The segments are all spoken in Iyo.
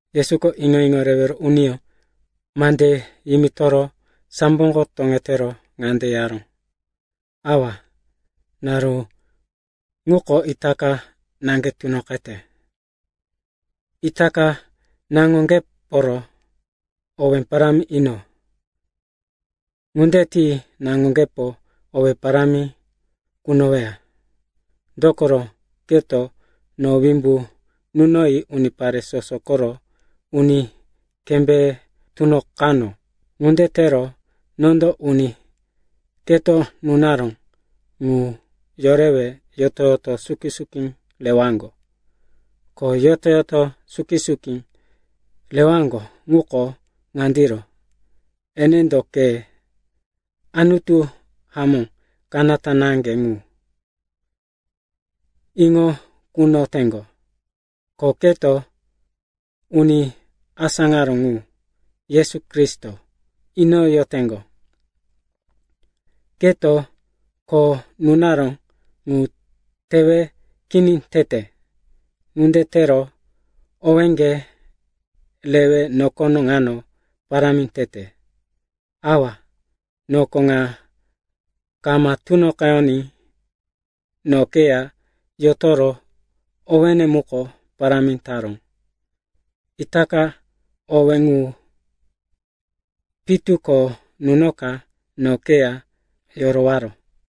Yesuko iŋo-iŋo rewero uniyó mande yimitoro samboko toŋetero, ŋande yaró, “Awa, naru ŋuko itaka naŋge tunoqete. Itaka naŋoŋgeporo owé parámi ino. Ŋunde ti naŋoŋgepo owé parámi kunoweya. Dokoro, keto no wimbu nunoyi unipare soso koro uni kembéye tunoqano. Ŋunde tero nondo uni keto nunaró ŋu yorewe yoto-yoto suki-suki rewaŋgo. Ko yoto-yoto suki-suki rewaŋgo ŋuko ŋandiro, enendo ke, Anutu hamó kanata naŋge ŋu, iŋo kunoyoteŋgo, ko keto uni asáŋaró ŋu, Yesu Kristo, iŋo inoyoteŋgo. Keto kho nunaró ŋu tewe kini tete. Ŋunde tero owéŋge rewe nokono ŋano parámi tete. Awa, noko ŋa kama tunoqeyoní, no keya yotoro owéne muko parámi taró. Itaka owé ŋu pitu ko nunoka no keya yorowaro.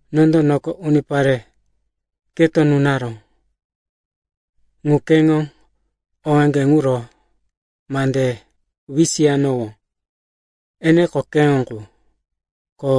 “Nondo noko unipare keto nunaró ŋu keŋo owéŋge ŋuro mande wisiyanowó. Eneko keŋo qu, ko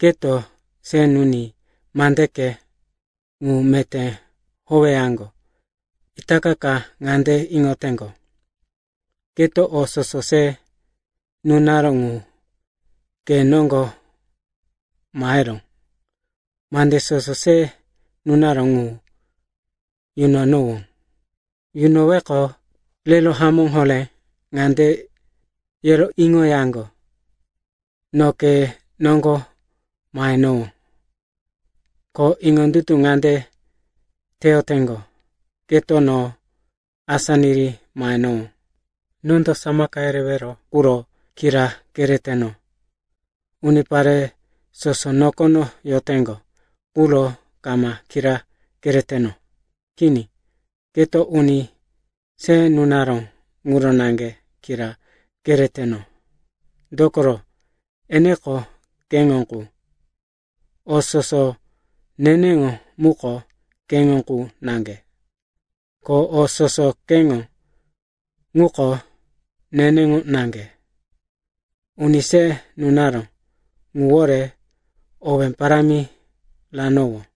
keto se nuni mandeke ŋu meté howeyaŋgo. Itaka ŋande iŋoteŋgo, keto o soso se nunaró ŋu ke noŋgo maheró. Mande soso se nunaró ŋu yunanowó. Yunoweqo, rero hamó horé ŋande yero iŋoyaŋgo, no ke noŋgo mahenowó. Ko iŋondutu ŋande teyoteŋgo, keto no asá niri mahenowó. “Nondo samaka yerewero quro kira kereteno. Unipare soso nokono yoteŋgo quro kama kira kereteno. Kini. Keto uni se nunaró ŋuro naŋge kira kereteno. Dokoro, eneko keŋo ŋu. O soso neneŋo muko keŋo qu naŋge. Ko o soso keŋo muko neneŋo naŋge. Uni se nunaró ŋuwore owé parámi ranowó.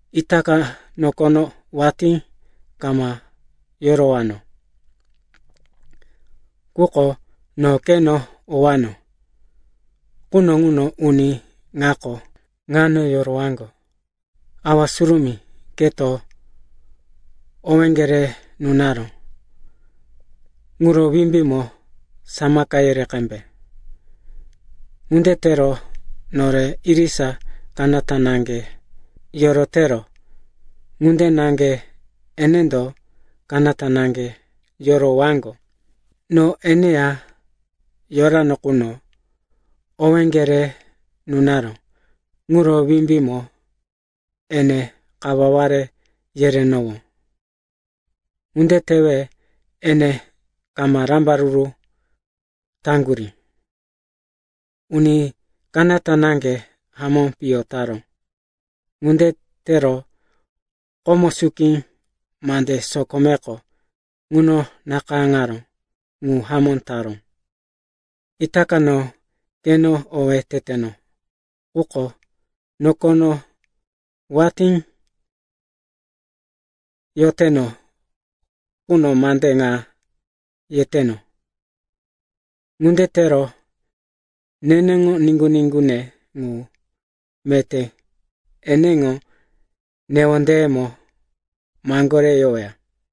Itaka nokono watí kama yorowano. Quko no keno owano quno ŋuno uni ŋako ŋano yorowaŋgo. Awa Surumí, keto owéŋge re nunaró ŋuro wimbímo samaka yere qembe. Ŋunde tero nore irisa kanata naŋge yorotero ŋunde naŋge enendo kanata naŋge yorowaŋgo. “No eneya yorano quno, owéŋge re nunaró ŋuro wimbímo ene kawaware yerenowó. Ŋunde tewe ene kama rambaruru taŋgurí. Uni kanata naŋge hamó piyo taró. Ŋunde tero komo suki mande sokomeko ŋuno nakayáŋaró ŋu hamó taró. “Itaka no keno owé teteno. Quko nokono watí yoteno quno mande ŋa yeteno. Ŋunde tero neneŋo niŋgu-niŋgune ŋu meté eneŋo newondeyemo maŋgore yoweya.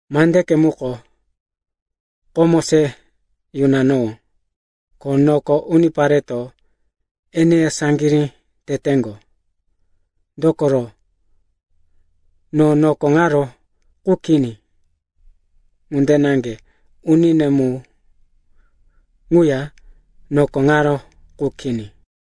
Mandeke muko, komo se yunanowó. Ko noko unipareto eneya saŋgirí teteŋgo. Dokoro no noko ŋaro qu kini, ŋunde naŋge unine mu ŋuya noko ŋaro qu kini.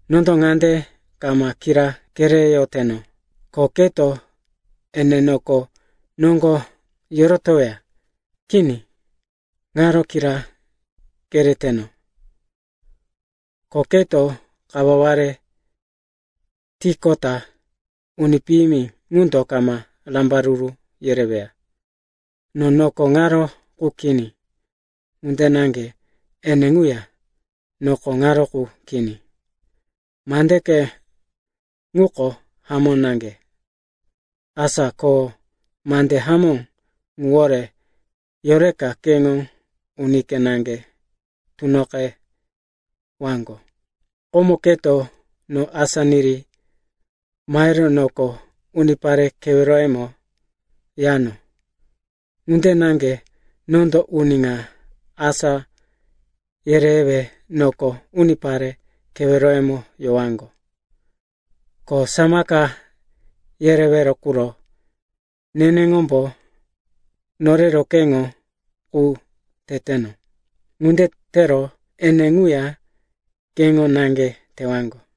Nondo ŋande kama kira kereyoteno, ko keto ene noko noŋgo yorotoweya. Kini, ŋaro kira kereyoteno, ko keto kawaware tiqota uni piyimi ŋundo kama rambaruru yereweya. No noko ŋaro qu kini, ŋunde naŋge ene ŋuya noko ŋaro qu kini. Mandeke muko hamó naŋge, asa ko mande hamó ŋuwore yoreka keŋo unike naŋge tunoqewaŋgo. Komo keto no asá niri mahero noko unipare keweroyemo yano. Ŋunde naŋge nondo uni ŋa asá yerewe noko unipare keweroyemo yowaŋgo. Ko samaka yerewero quro neneŋombo norero keŋo qu teteno. Ŋunde tero ene ŋuya keŋo na tewaŋgo.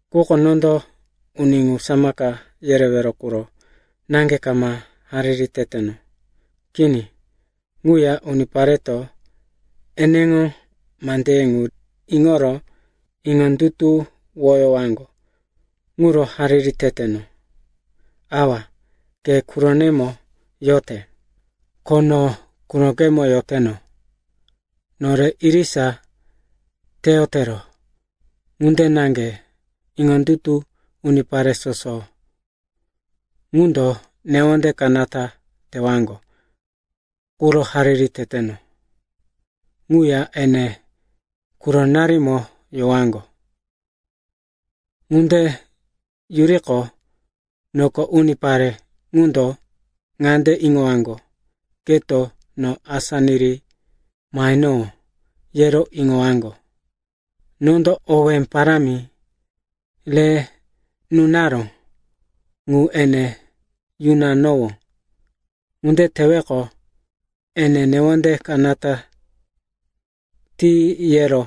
“Quko nondo uni ŋu samaka yerewero quro naŋge kama hariri teteno. Kini. Ŋuya unipareto eneŋo mandeye ŋu iŋoro iŋondutuwoyowaŋgo ŋuro hariri teteno. Awa, ke quronemo yote, ko no qurokemo yoteno. Nore irisa teyotero ŋunde naŋge iŋondutu unipare soso ŋundo newonde kanata tewaŋgo quro hariri teteno. Ŋuya ene quronarimo yowaŋgo. Ŋunde yuriqo, noko unipare ŋundo ŋande iŋowaŋgo, keto no asá niri mahenowó, yero iŋowaŋgo. Nondo owé parámi re nunaró ŋu ene yunanowó. Ŋunde teweqo, ene newonde kanata ti yero,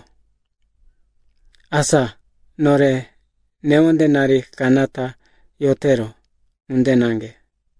asa nore newondenari kanata yotero ŋunde naŋge.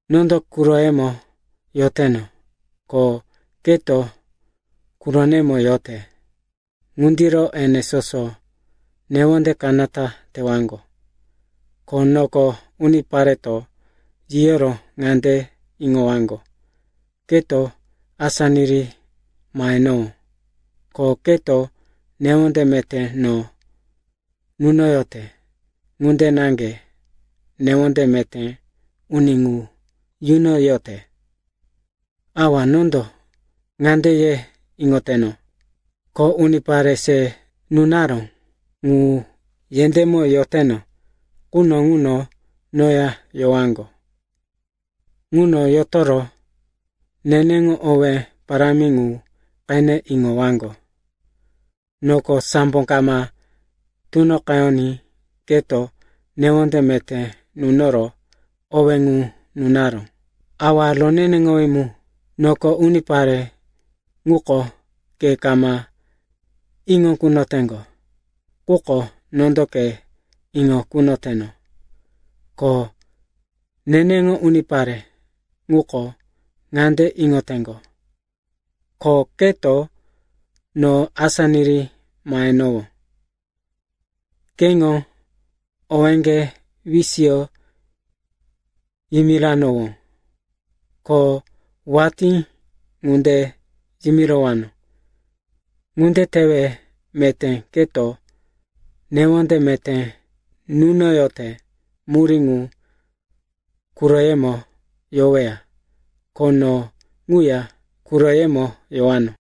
Nondo quroyemo yoteno, ko keto quronemo yote. Ŋundiro ene soso newonde kanata tewaŋgo, ko noko unipareto yiyoro ŋande iŋowaŋgo, keto asá niri mahenowó, ko keto newonde meté no nunoyote ŋunde naŋge newonde meté uni ŋu yunoyote. “Awa, nondo ŋande ye iŋoyoteno, ko unipare se nunaró ŋu yendémo yoteno quno ŋuno noya yowaŋgo. Ŋuno yotoro neneŋo owé parámi ŋu qene iŋowaŋgo. Noko sambo kama tunoqeyoní keto newonde meté nunoro owé ŋu nunaró. “Awa Roneneŋowí Mu, noko unipare ŋuko ke kama iŋo kunoteŋgo. Quko nondo ke iŋo kunoteno. Ko neneŋo unipare ŋuko ŋande iŋoteŋgo, ko keto no asá niri mahenowó. Keŋo owéŋge wisiyo yimiranowó. Ko watí ŋunde yimirowano. Ŋunde tewe meté keto newonde meté nunoyote murí ŋu quroyemo yoweya, ko no ŋuya quroyemo yowano.”